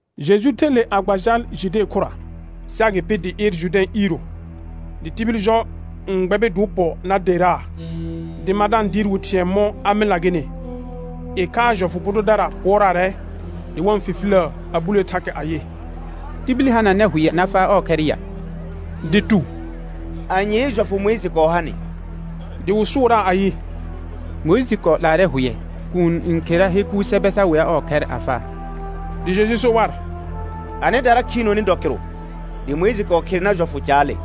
Jeju ther le a gba jal Jude khʋra, sɩ agɩpɩ dɩ ɩɩr Jʋrdɛ̃ iiro. Dɩ tibil jɔ n gbɛbɩ dɩ wɩ pɔ na derraa, dɩ ma da-n dɩɩr wɩ thɩ̃ɛ mɔ̃ a mɩlna gɩnɩ. Ɩkhaa jɔfʋ bʋ dʋdara pʋɔraarɛ, dɩ wa-n fifiləə a bulee thakɛ ayɩ: Tibil hananɛ hʋɛ na faa ɔɔ khɛr ya? Dɩ tu: Anyee jɔfʋ Mʋɩjɩ kɔɔ ha nɩ? Dɩ wɩ sʋʋraa ayɩ: Mʋɩjɩ kɔɔ 'laarɛ hʋɛ, kuun n khera he kuur sɛbɛ sa wea ɔɔ khɛr a faa. Dɩ Jeju so war: Anɩdara khiinoni dɔ kɩrʋ dɩ Mʋɩjɩ kɔɔ khere nar jɔfʋ caale.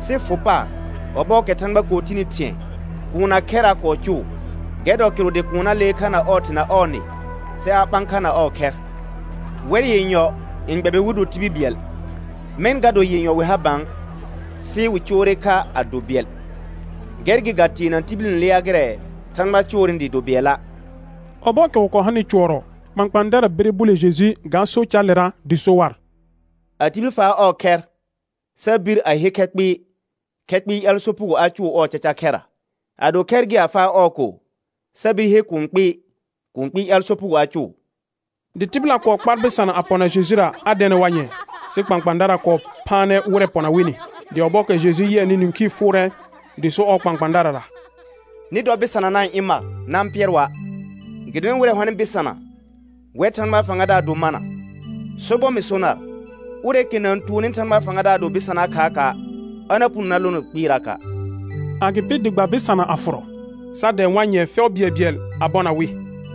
Sɩ fʋ paar, ɔbɔɔkɛ Thãgba kɔɔ tini thɩ̃ɛ, kuun na khɛr a kɔɔ cʋʋ. Gɛr dɔ kɩrʋ dɩ kuun na lee kha na ɔɔ thɩ na ɔɔ nɩ, sɩ a ɓã kha na ɔɔ khɛr, wɛr yenyɔ n gbɛbɩ wɩ do tibil bɩɛl, mɛ̃ ga do yenyɔ ha bã, sɩ wɩ coore kha a do bɩɛl. Gɛr gɩ ga teena tibil n lea gɩrɛ Thãgba coornɩ dɩɩ do bɩɛla'. Ɔbɔɔkɛ wɩ kɔɔ hanɩ cʋɔrɔ, kpãkpãadara bire bule Jeju ga so caalera, dɩ so war: A tibil faa ɔɔ khɛr sa bir a he khɛ kpɩɩ, khɛ kpɩɩ ƴaal sopugo a cʋʋ ɔɔ caca khɛrra. Ado khɛr gɩ a faa ɔɔ ko sa bir he kũu kpɩɩ, kũu kpɩɩ ƴaal sopugo a cʋʋ. Dɩ tɩbɩla kɔɔ kpar bɩsana a pɔna Jejura, a dɛɛnɛ war nyɛ̃ɛ, sɩ kpãkpãadara kɔɔ phaanɛ wɩrɛ pɔna wɩnɩ. Dɩ ɔbɔɔkɛ Jeju yɩɛnɩ nĩkhii fʋʋrɛ, dɩ so ɔɔ kpãkpãadarara: Nɩ dɔ bɩsana na-n ɩ̃ mar, na-n pɩɛr wa', gɩdonɩ wɩrɛ hɔnɩ bɩsana, wɛr Thãgbaa fãgadaar do mana. Sobɔr mɩ so nar, ʋrɛɛkɛ na-n tuonni Thãgbaa fãgadaar do bɩsanaa khaaka', a na puno na lono kpɩɩraka'. Agɩpɩ dɩ gba bɩsana a fʋrɔ, sa dɛ̃ɛ war fɛʋ bɩɛlbɩɛl nyɛ̃ɛ a bɔna wɩ.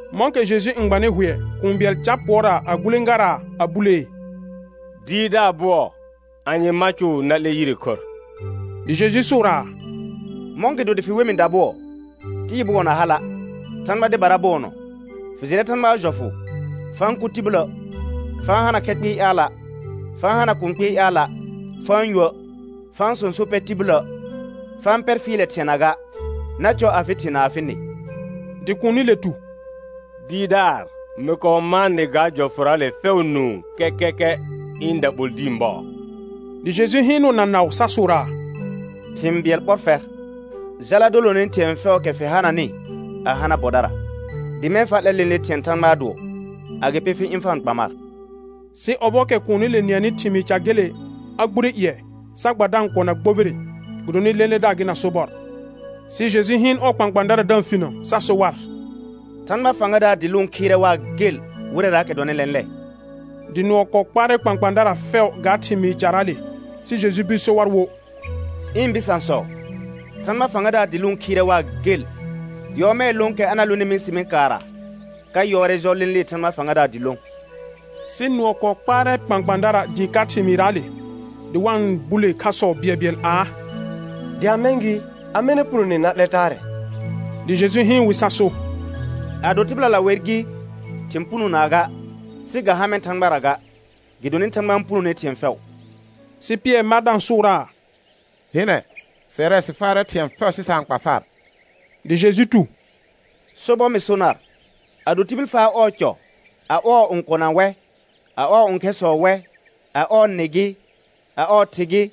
Mɔ̃kɛ Jeju n gbanɩ hʋɛ, kũu bɩɛl car pʋɔraa a gulẽgaraa a bulee: Dɩɩrdaar bʋɔ, anye ma cʋʋ na 'lɛ yire khorr? Dɩ Jeju sʋʋraa: Mɔ̃gɩdo dɩ fɩ we mɩ dabʋɔ? Tɩɩ bʋɔ na hala', Thãgba dɩbara bʋɔnɔ. Fɩ jɩrɛ Thãgbaa jɔfʋ: «Fa-n kʋ tibilə', fa-n hana khɛ kpɩɩ ƴaala', fa-n hana kũu kpɩɩ ƴaala', fa-n yuə', fa-n sõso pɛ tibilə', fa-n pɛr fɩɩlɛ thɩɛna ga, na cɔ afɩ thɩ na afɩ nɩ.» Dɩ kuunile tu: Dɩɩrdaar mɩ kɔɔ mãa nɩ ga jɔfʋraale fɛʋ nũu kɛkɛkɛ ɩ̃ daɓol dĩi bɔɔ. Dɩ Jeju hɩɩnʋʋ na naʋ sa sʋʋraa: Thɩ̃ bɩɛl ɓɔr fɛr, jala dolone thɩ̃ɛ fɛʋʋkɛ fɩ hananɩ a hana bɔdara, dɩ mɛ̃ fa 'lɛ lẽle thɩ̃ɛ Thãgbaa dʋɔ, agɩpɩ fɩ ɩ̃ fa-n kpa mar. Sɩ ɔbɔɔkɛ kuunile nɩɛnɩ thɩmɩɩ ca gele a gbure ƴɩɛ, sa gba da-n kɔna gbobire, gɩdonɩ lẽledaar gɩ na sobɔr. Sɩ Jeju hɩɩn ɔɔ kpãkpãadara da-n finə sa so war: Thãgba fãgadaar dɩ lʋʋn khɩɩrɛ waa gel wɩrɛraakɛ dɔnɩ lɛ̃lɛ. Dɩ nʋɔ kɔɔ kpaarɛ kpãkpãadara fɛʋ ga thɩmɩɩ caraale; sɩ Jeju bir so war wo: Ɩ̃ bɩsãsɔ, Thãgba fãgadaar dɩ lʋʋn khɩɩrɛ waa gel. Nyɔɔmɛɛ lõokɛ a na lonɩ mɩsɩmɩ kaarra ka yɔɔrɛ jɔ lẽlee Thãgba fãgadaar dɩ lõ. Sɩ nʋɔ kɔɔ kpaarɛ kpãkpãadara dɩɩ ka thɩmɩɩrraale, dɩ wa-n bule khasɔ bɩɛlbɩɛl aa: Dɩ a mɛ̃ gɩ, amɛ na punone na 'lɛ taarɛ? Dɩ Jeju hɩɩn wɩ sa so: Ado tɩbɩlala wer gɩ, thɩ̃ punonaa ga; sɩ ga ha mɛ̃ Thãgbara ga, gɩdonɩ Thãgba n punone thɩ̃ɛ fɛʋ. Sɩ Pɩɛr ma da-n sʋʋraa: Hɩnɛ, sɛrɛ sɩ faarɛ thɩ̃ɛ fɛʋ sɩ sa-n kpa far. Dɩ Jeju tu: Sobɔr mɩ so nar, ado tibil faa ɔɔ cɔ, a ɔɔ õkona wɛ, a ɔɔ õkhɛrsɔ wɛ, a ɔɔ nɩ gɩ, a ɔɔ thɩ gɩ,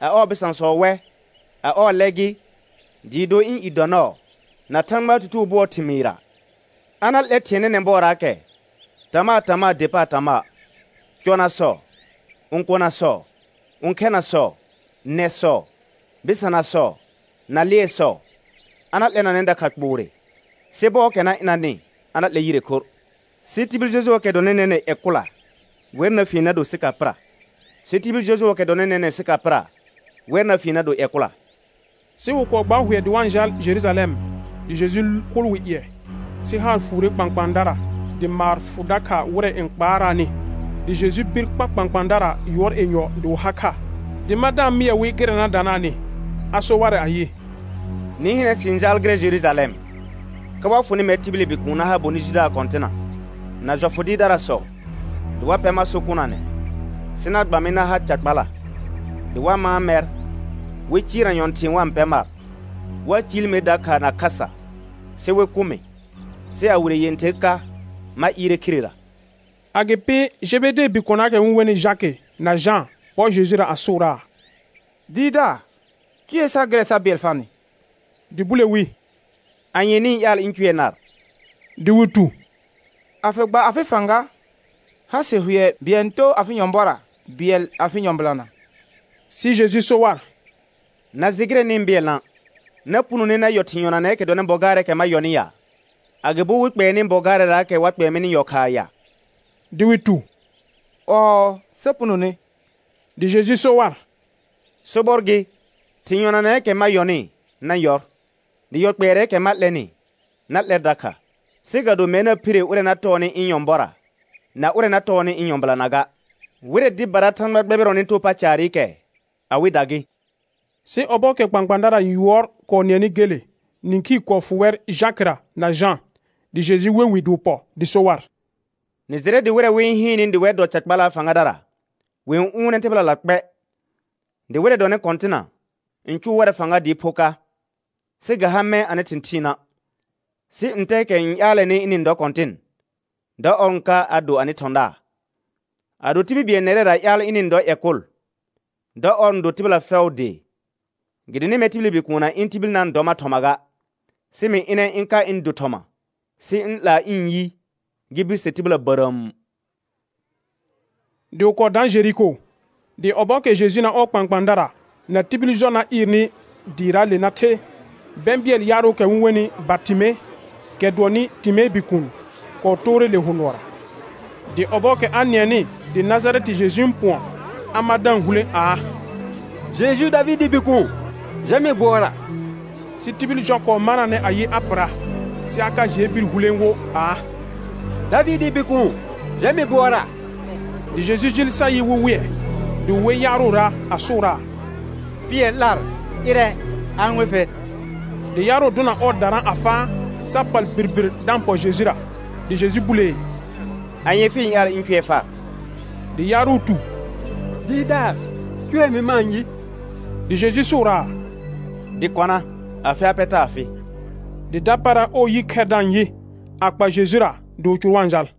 a ɔɔ bɩsãsɔ wɛ, a ɔɔ lɛ gɩ, dɩɩ do ɩ̃ i dɔ nɔɔ na Thãgbaa tutugo bʋɔɔ thɩmɩɩra, a na 'lɛr thɩ̃ɛ nɛnɛ̃ bɔɔraakɛ tama tama der paar tamaa: Gɔnasɔ, õkonasɔ, õkhɛnasɔ, nɛsɔ, bɩsanasɔ, na lɩɛsɔ, a na 'lɛnanɛ dakha kpoore, sɩ bɔɔkɛ na ɩnanɩ a na 'lɛr yire khorr. Sɩ tibil jɔjʋɔɔkɛ dɔnɩ nɛnɛ̃ ƴɛ kʋla, wɛr na fien na do sɩka pɩra, sɩ tibil jɔjʋɔɔkɛ dɔnɩ nɛnɛ̃ sɩka pɩra, wɛr na fien na do ƴɛ kʋla. Sɩ wɩ kɔɔ gbaar hʋɛ dɩ wa-n jal Jerujalɛm, dɩ Jeju kʋʋl wɩ ƴɩɛ. Sɩ haar fuure kpãkpãadara dɩ maar fʋ dakha wɩrɛ n kpaaraanɩ. Dɩ Jeju bir kpa kpãkpãadara yʋɔr yenyɔ dɩ wɩ ha kha, dɩ ma da-n mɩɛ wɩ gɩrɛ na danaanɩ. A so warɛ ayɩ: Nɩ hɩnɛ, sɩ-n jaal gɩrɛ Jerujalɛm, ka wa fʋnɩ mɛr tibili Bikuun na ha bonɩ jidaar kɔ̃tɩna, na jɔfʋ dɩɩrdarasɔ, dɩ wa pɛ mar so kʋnanɛ; sɩ na gba mɩ na ha ca kpala; dɩ wa mãa mɛr, wɩ cɩɩrna nyɔ̃thɩ̃ɩ wa-n pɛ mar, wa ciil mer dakha na khasa, sɩ wɩ kʋ mɩ, sɩ a wire yẽther ka ma ɩɩrɛ khirera. Agɩpɩ Jebedee bikonaakɛ wɩ-n wenɩ Jakɩ na Jã pɔ Jejura, a sʋʋraa: Dɩɩrdaar, cʋɛ sar gɩrɛ sa bɩɛl farnɩ. Dɩ bule wi: Anye nɩ-n ƴaal ɩ̃ cʋɛ nar? Dɩ wɩ tu: A fɩ gba afɩ fãga, ha sɩ hʋɛ, bɩɛl n too afɩ nyɔ̃bɔra, bɩɛl afɩ nyɔ̃bɩlana. Sɩ Jeju so war: Na jɩ gɩrɛ nɩ-n bɩɛlna'; na punone na yɔ thɩ̃ yɔnanɛɛkɛ dɔnɩ bɔ gaarɛɛkɛ ma yɔnɩ ya? Agɩbo wɩ kpɛɛ nɩ bɔ gaarɛraakɛ wa kpɛɛ mɩnɩ yɔ khaa ya? Dɩ wɩ tu: Ɔɔ, sa punone. Dɩ Jeju so war: Sobɔr gɩ, thɩ̃ yɔnanɛɛkɛ ma yɔnɩ na yɔr, dɩ yɔ kpɛɛrɛɛkɛ ma 'lɛnɩ na 'lɛr dakha. Sɩ ga do mɛr na phire ʋrɛ na tɔɔnɩ ɩ̃ nyɔ̃bɔra na ʋrɛ na tɔɔnɩ ɩ̃ nyɔ̃bɩlana ga; wɩrɛ dɩbara Thãgba gbɛbɩrɔnɩ too paa caarɩkɛ, awɩda gɩ. Sɩ ɔbɔɔkɛ kpãkpãadara yʋɔr kɔɔ nɩɛnɩ gele, nĩkhii kɔɔ fʋ wɛr Jakɩra na Jã. Dɩ Jeju we wɩ dɩ wɩ pɔ, dɩ so war: Nɩ jɩrɛ dɩ wɩrɛ wɩ-n hɩɩnnɩ dɩ wɛr dɔ ca kpalaa fãgadara, wɩ-n ʋʋnɛ tɩbɩlala kpɛ, dɩ wɩrɛ dɔnɩ kɔ̃tɩna n cʋʋ warɛ fãga dɩɩ pho ka. Sɩ ga ha mɛ̃ anɩ thɩ̃thɩɩna', sɩ ntɛɛkɛ n ƴaalɛnɩ ɩnɩ-n dɔ kɔ̃tɩn, dɔ ɔr n ka a do anɩ thɔ̃daar. Ado tibil bɩɛl nɛrɛra ƴaal ɩnɩ-n dɔ ƴɛ kʋl, dɔ ɔr n do tɩbɩla fɛʋʋ dee. Gɩdonɩ mɛr tibili Bikuun na ɩ̃ tibil na-n dɔ mar thɔma ga, sɩ mɩ ɩnɛ ɩ̃ ka ɩ̃ do thɔma sɩ ɩ̃ 'laa ɩ̃ yi gɩ birse tɩbɩla bərəəm. Dɩ wɩ kɔɔ daan Jeriko; dɩ ɔbɔɔkɛ Jeju na ɔɔ kpãkpãadara na tibil jɔ na ɩɩrnɩ dɩɩraale na the, bɛ̃bɩɛl yaarʋʋkɛ wɩ-n wenɩ Bartɩme, kɛ dʋɔnnɩ Timee bikuun, kɔɔ toore le hʋ nʋɔra. Dɩ ɔbɔɔkɛ a nɩɛnɩ dɩ Najarɛtɩ Jeju n pʋɔn, a mar da-n hulẽ aa: Jeju Davɩdɩɩ Bikuun, jɛ mɩ bʋɔra. Sɩ tibil jɔ kɔɔ manaanɛ ayɩ a pɩra; sɩ a ka jɩɛ bir hulẽ wo aa: Davɩdɩɩ Bikuun, jɛ mɩ bʋɔra. Dɩ Jeju jɩɩl sa yɩ wɩ wɩɛ. Dɩ wɩ wer yaarʋra a sʋʋraa: Pɩɛr 'lar, ɩrɛ, a-n we fer. Dɩ yaarʋ dʋna ɔɔ darã a faa, sa pal birbir da-n pɔ Jejura. Dɩ Jeju bulee: Anye fɩ-n ƴaal ɩ̃ cʋɛ far? Dɩ yaarʋ tu: Dɩɩrdaar, cʋɛ mɩ ma-n yɩ. Dɩ Jeju sʋʋraa: Dɩ kɔna, afɩ ha pɛ taa fɩ. Dɩ dapaara ɔɔ yi khɛr da-n yɩ, a kpa Jejura dɩ wɩ cʋr wa-n jal.